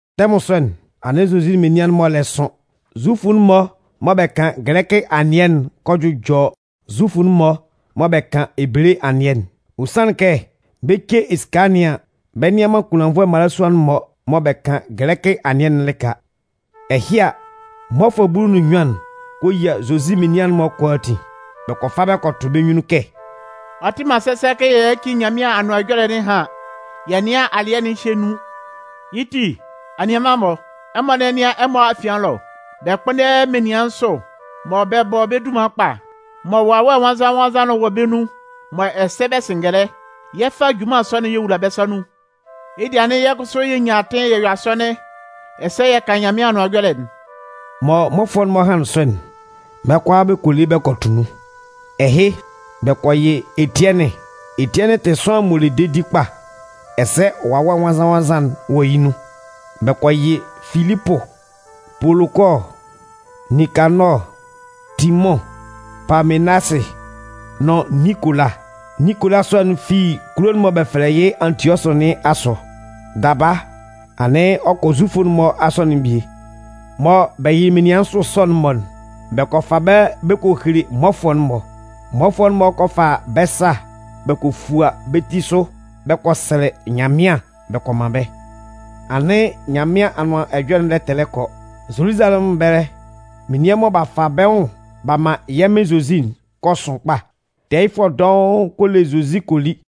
Tɛmʋn sɔ'n, anɩn Zozi menian'n-mɔ lɛ sʋn. Zufʋ'n-mɔ mɔ bɛ kan gɛlɛkɩ anɩɛ'n kɔ jʋjɔ Zufʋ'n-mɔ mɔ bɛ kan Ebele anɩɛ'n. Ɔ sanlɩn kɛ, bɛ 'ce esika nɩn an, bɛ nnɩan man kunlannvʋɛ mmalasua'n-mɔ mɔ bɛ kan gɛlɛkɩ anɩɛ'n lɩka. Ɛhɩ a, mmɔfʋɛ bulu nʋn nnyuan'n kɔ yia Zozi menian'n-mɔ kʋalaatin, bɛ kɔ fa bɛ kɔ tʋ bɛ́ nyunnun kɛ: “Ɔ tɩ man sɛsɛ kɛ yɛ yáci Nyanmɩan Anʋan Ɛjɔlɛ nɩn ɛhan yɛ nɩ́an alɩɛ nɩn ehye nun. Yɩ́ ti, anianman-mɔ, ɛmɔ nɛ́nɩan ɛmɔ afian ɛlɔ, bɛ kpʋ́nndɛ menian nsʋ mɔ bɛ bɔ bɛ́ dunman kpa, mɔ Wawɛ Nwannzan-nwannzan'n wɔ bɛ́ nun, mɔ ɛsɛ bɛ sɩ ngɛlɛ. Yɛ 'fa junman sɔ'n yɛ wula bɛ́ sa nun. Yɩ́ dɩɛ anɩn yɛ́ kʋsʋ yɛ nyan atɩn yɛ yɔ asɔnɩn ɛsɛ yɛ kan Nyanmɩan Anʋan Ɛjɔlɛ'n.” Mɔ mmɔfʋɛ'n-mɔ hanlɩn sɔ'n, bɛ́ kʋalaa bɛ kɔ le bɛ kɔ tʋ nun. Ɛhɩ, bɛ kɔ yɩ Etiɛnɩn. Etiɛnɩn tɩ sʋanlan m'ɔ le dedi kpa, ɛsɛ Wawɛ Nwannzan-nwannzan'n wɔ yɩ́ nun. Bɛ kɔ yɩ Filipʋ, Polokɔɔ, Ninkanɔɔ, Timʋn, Paamenasɩ nʋn Ninkola. Ninkola sɔ'n fi kulo'n mɔ bɛ fɛlɛ yɩ́ Antiɔsʋ nɩn asʋ. Daba, anɩn ɔ kɔ Zufʋ'n-mɔ asɔnɩn'n bie. Mɔ bɛ yɩlɩ menian nsʋ sɔ'n-mɔ'n, bɛ kɔ fa bɛ́ bɛ kɔ hele mmɔfʋɛ'n-mɔ. Mmɔfʋɛ'n-mɔ kɔ fa bɛ́ sa bɛ kɔ fua bɛ́ ti sʋ bɛ kɔ sɛlɛ Nyanmɩan bɛ kɔ man bɛ́. Anɩn Nyanmɩan Anʋan Ɛjɔlɛ'n lɛ tɛlɛ kɔ, Zoluzalɛmʋn ɛbɛlɛ menian mɔ b'a fa bɛ́ nwʋn b'a man yɛ́ Mɩn Zozi'n kɔ sʋn kpa. Tɛɛyɩfʋɛ dɔʋn kɔ le Zozi kɔ li.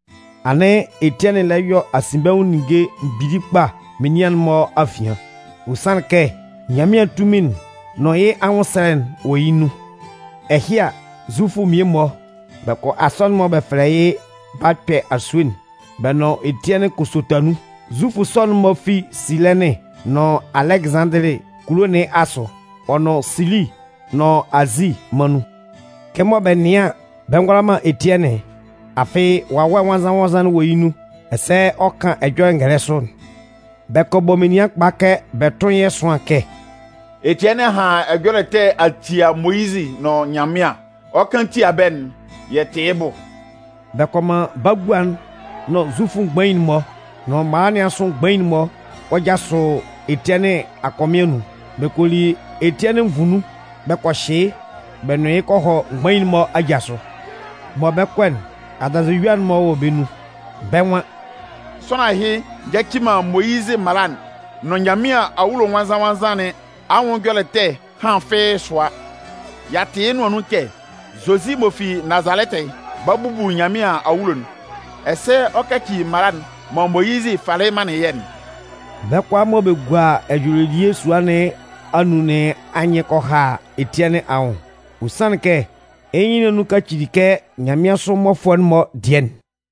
Anɩn Etiɛnɩn lɛ yɔ asinbɛnwʋn ninnge mgbili kpa menian'n-mɔ afian. Ɔ sanlɩn kɛ Nyanmɩan tunmin'n nʋn yɩ́ anwʋnsɛlɛ'n wɔ yɩ́ nun. Ɛhɩ a, Zufʋ mmie-mɔ, bɛ kɔ asɔnɩn'n mɔ bɛ fɛlɛ yɩ́ “B'a kpɛ asue'n” bɛ nʋn Etiɛnɩn kɔ sota nun. Zufʋ sɔ'n-mɔ fi Silɛnɩn nʋn Alɛgɩzanndili kulo nɩn asʋ, ɔ nʋn Silisi nʋn Azi mân nun. Kɛmɔ bɛ nɩan an, bɛ ngʋala man Etiɛnɩn, afɩ Wawɛ Nwannzan-nwannzan wɔ yɩ́ nun ɛsɛ ɔ kan ɛjɔlɛ'n ngɛlɛ sʋ'n, bɛ kɔ bɔ menian kpa kɛ bɛ tʋ́n yɩ́ ɛsʋan kɛ: “Etiɛnɩn a han ɛjɔlɛ ɛtɛ a tia Moyizɩ nʋn Nyanmɩan. Ɔ 'kan tia bɛ́'n, yɛ tɩ yɩ́ bʋ.” Bɛ kɔ man bagua'n nʋn Zufʋ mgbain'n-mɔ nʋn mala nɩn asʋ mgbain'n-mɔ kɔ jasʋ Etiɛnɩn akɔmɩn anun. Bɛ kɔ li Etiɛnɩn nvu nun bɛ kɔ hyɩ yɩ́ bɛ nʋn yɩ́ kɔ hɔ mgbain'n-mɔ aja sʋ. Mɔ bɛ 'kɔ'n, adanzɩyua'n-mɔ wɔ bɛ́ nun. Bɛ́ nwan: “Sʋanlan ɛhɩ nyaci man Moyizɩ mala'n nʋn Nyanmɩan Awulo Nwannzan-nwannzan nɩn anwʋn ɛjɔlɛ ɛtɛ ɛhan fɩ́ɩ́ sʋa! Y'a tɩ yɩ́ nʋan nun kɛ Zozi m'ɔ fi Nazalɛtɩ'n 'ba bubu Nyanmɩan awulo'n, ɛsɛ ɔ 'kaci mala'n mɔ Moyizɩ falɩ manlɩn yɛ́'n.” Bɛ́ kʋalaa mɔ bɛ gua ɛjɔlɛ elie sua nɩn anun nɩn anyɩn kɔ ha Etiɛnɩn anwʋn. Ɔ sanlɩn kɛ yɩ́ nyɩn nɩn anun kacili kɛ nyanmɩansʋ mmɔfʋɛ'n-mɔ dɩɛ'n.